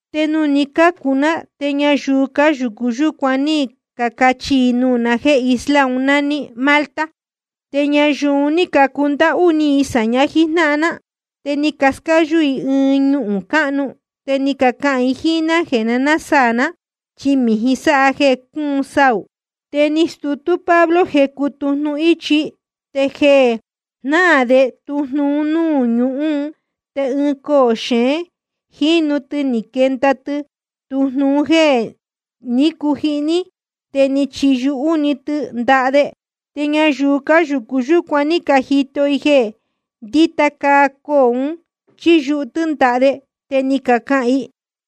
Te nuū ní cacācu ná te ñayuu cáyūcu yúcuan ní cacachi i nuū na jéē isla un nání Malta. Te ñayuu un ní cacundáhú ni i sāña jíjnáhan ná, te ni cascáyú i ɨɨn ñuhūn cáhnu, te ni cacahān i jíín ná jeē nasaā ná, chi mījin sáha jeē cúun saū. Te ni stutú Pablo jecu tujnu íchi. Te jeē jnáā de tujnu un núū ñuhún te ɨɨn coō xeén jínu tɨ ni quenda tɨ tujnu un jéē ní cujihní, te ni chiyuhú‑ni tɨ ndaha de. Te ñayuu cáyūcu yúcuan ní cajito i jeē ndíta caa coō un yɨ́yuhú tɨ́ ndaha de, te ni cacahān i: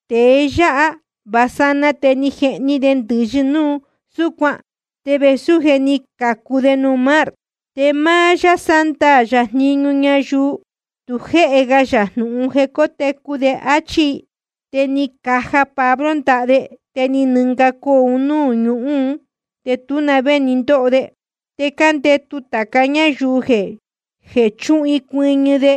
Tēe yáha vā sanaa te ni jehni de ndɨ̄yɨ núu súcuan, te vēsú je ni cācu de nuū mar, te máá yáā sándaā jniñu ñayuu tu jéhe ga yā jnūhun jeē cótecu de, áchí i. Te ni caja Pablo ndaha de, te ni nɨnga coō un núū ñuhún, te tú na vé ni ndóho de. Te cándētu tāca ñáyuu jeē chúhun i cuɨñɨ de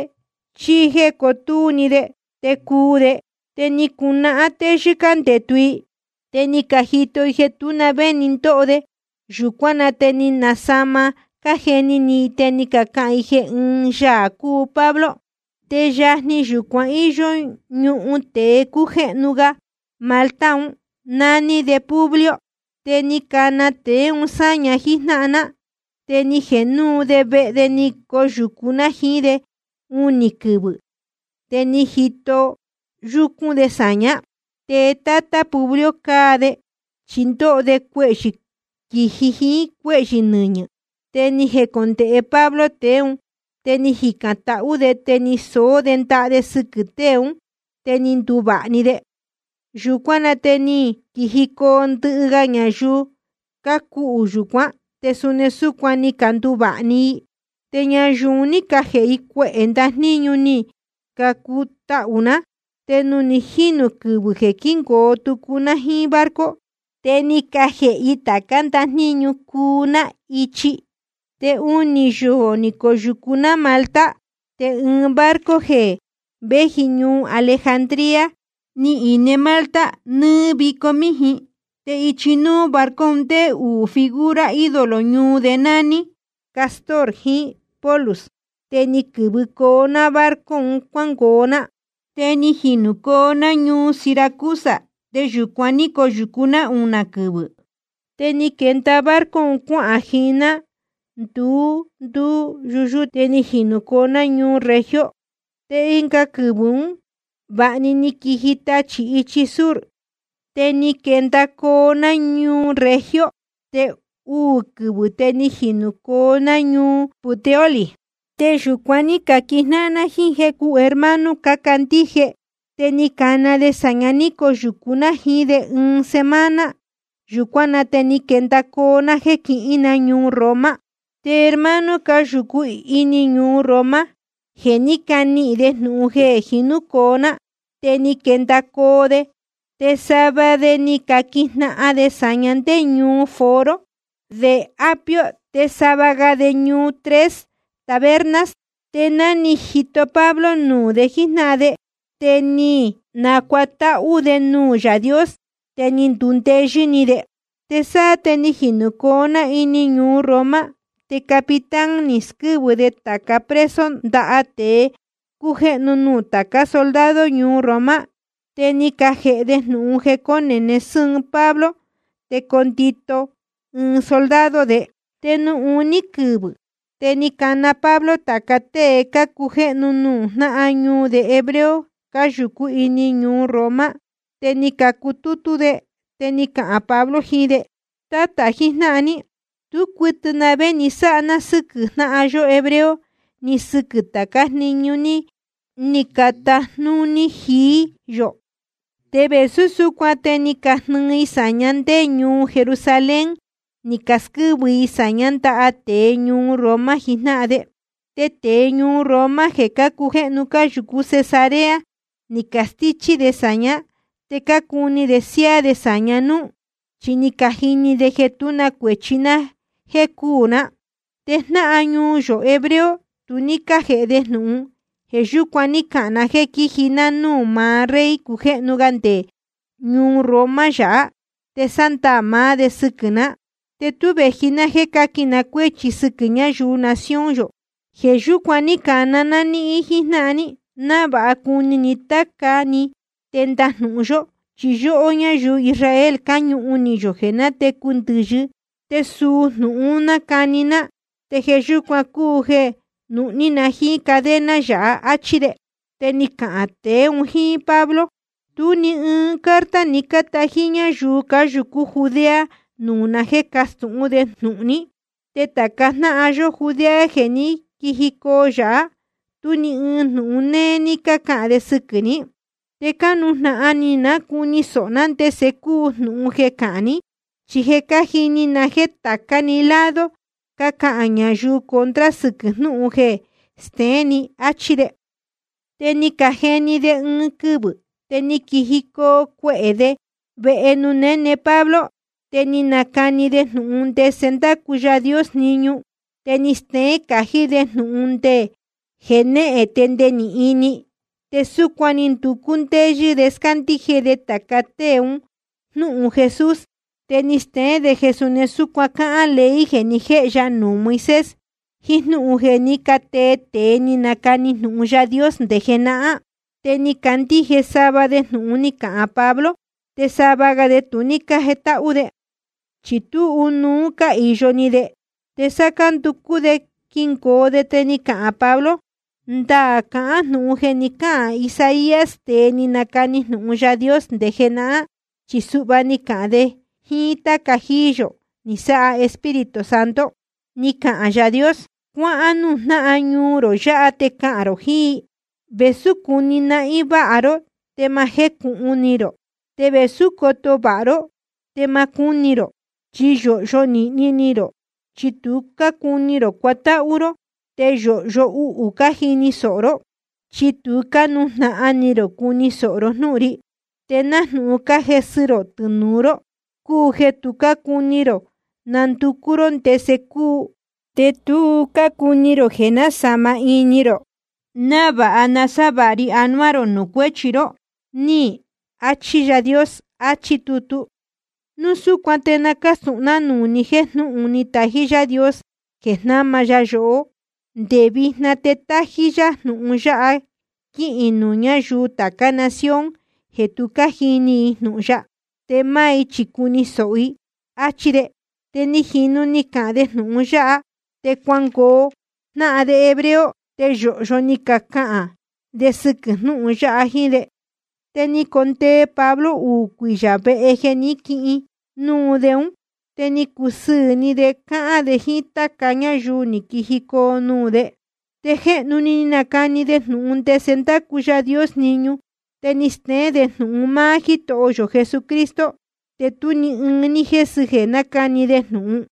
chí cotúú‑ni de te cuu de. Te ni cunahán téyɨ́ cándētu i, te ni cajito i jeē tú na vé ni ndóho de. Yūcuán na te ni nasāma cájeni ni i, te ni cacahān i jeē ɨ́ɨn yaā cúu Pablo. Te yajni yūcuan íyó ñuhun tēe cújéhnu ga Malta un, nání de Publio. Te ni cana tēe un sáña jíjnáhan ná, te ni jēhe núu de vehe de ni coyūcu ná jiín de unī quɨvɨ̄, te ni jito yúcún de sāñá. Te tátá Publio cáa de, chi ndóho de cuehyɨ̄ quīji jiín cuéhyɨ̄ nɨñɨ̄. Te ni jecondēhe Pablo tēe ún, te ni jicān tahú de te ni soó de ndaha de sɨquɨ̄ tée ún, te ni nduvāha‑ni de. Yūcuán na te ni quijicoo ndɨhɨ ga ñayuu cácuhū yūcuán, te suni súcuan ni canduvāha‑ni i. Te ñayuu un ní cajēhe i cuehē ndajníñu ni cacutahū ná. Te nuū ni jínū quɨvɨ̄ jeē quíngoo tucu ná jíín barco, te ni cajēhe i tācá ndajníñu cuu ná ichi. Te unī yoō ni coyūcu ná Malta. Te ɨɨn barco jeē véji ñuu Alejandría ni ine Malta nɨɨ́ vico míjin, te ichi núú barco un ndéé uū figura ídolo ñuu de nání Cástor jiín Pólux. Te ni quɨ̄vɨcoo ná barco un cuángoo ná. Te ni jinūcoo ná ñuu Siracusa, te yūcuan ní coyūcu ná unī quɨvɨ̄. Te ni quenda barco cuahān jiín ná nduu nduu yundúte, te ni jinūcoo ná ñuu Regio. Te ɨnga quɨvɨ̄ ún vāha ni quiji tachī ichi sur, te ni quendacoo ná ñuu Regio, te uū quɨvɨ̄ te ni jinūcoo ná ñuu Puteoli. Te yūcuan ní caquijnáhan ná jíín jecu hermano cácandíje, te ni cacana de sāña ní coyūcu ná jiín de ɨɨn semana. Yūcuán na te ni quendacoo ná jéē quihīn ná ñuu Roma. Te hermano cáyūcú ini ñuu Roma, je ni canihīn de jnūhun jeē jinúcoo ná, te ni quendacoo de, te sava de ni caquijnahan de sāña ndé ñuu Foro de Apio te sava ga de ñuu Tres Tabernas. Te ná ni jito Pablo nuū de jíjnáhan de, te ni nacuatáhú de nuū Yaā Dios, te ni ndundeyɨ́ ni de. Te sáá te ni jinūcoo ná ini ñuu Roma, te capitán ni squɨ́vɨ de tāca preso ndaha tēe cújéhnu nuū tācá soldado ñuu Roma. Te ni cajēhe de jnūhun jeē cone sɨ́ɨn Pablo te condito ɨɨn soldado de. Te nuū uní quɨvɨ̄ te ni cana Pablo tāca tée cácujéhnu nuū jnáhan ñuu de hebreo cáyūcú ini ñuu Roma. Te ni cacutútú de, te ni cahān Pablo jiín de: Tátā jijnáhan ní, tú cuɨtɨ na vé ni sáha ná sɨ́quɨ̄ jnáhan yó hebreo ni sɨquɨ̄ tācá jniñu ní catajnúní jií yō. Te vēsú súcuan te ni cajnɨɨ i sāña ndé ñuu Jerusalén ni casquɨ́vɨ i sāñá ndaha tēe ñuu Roma jijnáhan de. Te tēe ñuu Roma jeē cácujéhnu cáyūcú Cesarea ni castíchí de sāñá, te cácuni de siáá de sāña núú, chi ni cajini de jeē tú na cuēchi ná jéē cúū ná. Te jnáhan ñuu yō hebreo tu ní cájēhe de jnūhun. Jeē yúcuan ní cahān na jéē quiji ná núū maá rey cujéhnu ga nde ñuu Roma yāhá te sándaā maá de sɨquɨ̄ ná. Te tú vēji ná jéē cáquin na cuéchi sɨquɨ̄ ñayuu nación yō. Jeē yúcuan ní cana ná níhín jíjnáhan ní, návāha cuni na táca ní te ndajnūhun yó. Chi yóhó ñáyuu Israel cáñūhun ni yō jeē nátecu ndɨ̄yɨ, te suu jnūhun un nácani ná, te jeē yúcuan cúu jeē nuhní na jíín cadena yáha, áchí de. Te ni cacahān tēe un jíín Pablo: Tú ni ɨɨn carta ni cátají ñáyuu cáyūcú Judea nuū na jéē cástūhún de jnūhun ní, te tāca jnáhan yó Judea jeē ní quijicoo yāhá, tú ni ɨɨn jnūhun néé ní cácahān de sɨquɨ̄ ní. Te cánujnahan ni ná cuni sōho ná ndese cúu jnūhun jeē cahán ni, chi je cájini na jéē tācá‑ni lado cácahān ñayuu contra sɨquɨ̄ jnúhun jeé jéē steén ni, áchí de. Te ni cajeni de ɨɨn quɨvɨ̄, te ni quijicoo cuehē de vehe nuū néne Pablo. Te ni nacani de jnūhun ndese ndácu Yaā Dios jniñu, te ni steén cají de jnūhun nde jenéhen te nde ni ini. Te súcuan ni nducú ndéyɨ́ de scándíje de tāca tée un jnúhun Jesús, te ni steén de jeē suni súcuan cáhán ley jeē ni jéhe ya nuū Moisés jiín jnúhun jeē ní catee tēe ni canacani jnūhun Yaā Dios nde jenahán. Te ni cacandíje sava de jnūhun ni cahān Pablo, te sava ga de tu ní cájetáhú de. Chi tú ɨnuú cáhīyo ni de. Te sáá cánducú de quingoo de te ni cahān Pablo: Ndaā cahán jnūhun jeē ni cáhān Isaías, tēe ni nacani jnūhun Yaā Dios nde jenahán, chi suhva ni cahān de jíín táca jíí yō ni sáha Espíritu Santo: Ni cahān Yaā Dios: Cuáhán núū jnáhan ñuu rō yāhá te cahān rō jiín i: Vēsú cuni nahín váha ró te ma jécūhun ni rō, te vēsú coto vāha ró te ma cúni rō. Chi yōhyo nīhni ni rō, chi tu cácuni rō cuatáhú ró. Te yōhyo uhū cájini sōho ró, chi tu cánujnahan ni rō cuni sōho ró jnúhun ri. Te nájnūhun cájesɨ rō tɨnūu ró cúu jeē tu cácuni rō nanducú ró ndese cúu, te tu cácuni rō jeē násāma ini rō návāha nasávāha ri anuá rō nuū cuéchi ró, ní achi Yaā Dios. Achí tutu. Núu súcuan te na cástūhun ná nuū ni jéē jnúhun ni tají Yáā Dios jeē jnáma ya yohó, nde vijna te tájí yá jnūhun yáha quíhīn nuū ñáyuu tācá nación jeē tu cájini i jnūhun ya, te máá i chi cuni sōho i, áchí de. Te ni jīnu ni cahān de jnūhun yáha, te cuangoo jnáhan de hebreo, te yōhyo ni cacahān de sɨquɨ̄ jnúhun yáha jíjnáhan de. Te ni condee Pablo uū cuiyā vehe jeē ní quihin núu de ún. Te ni cusɨɨ̄ ni de cahān de jíín táca ñáyuu ní quijicoo nuū de. Te jéhnu‑ni ni nacani de jnūhun ndese ndácu Yaā Dios jniñu, te ni steén de jnūhun máá Jítoho yō Jesucristo, te tú ni ɨɨn ní jésɨ jeē nácani de jnūhun.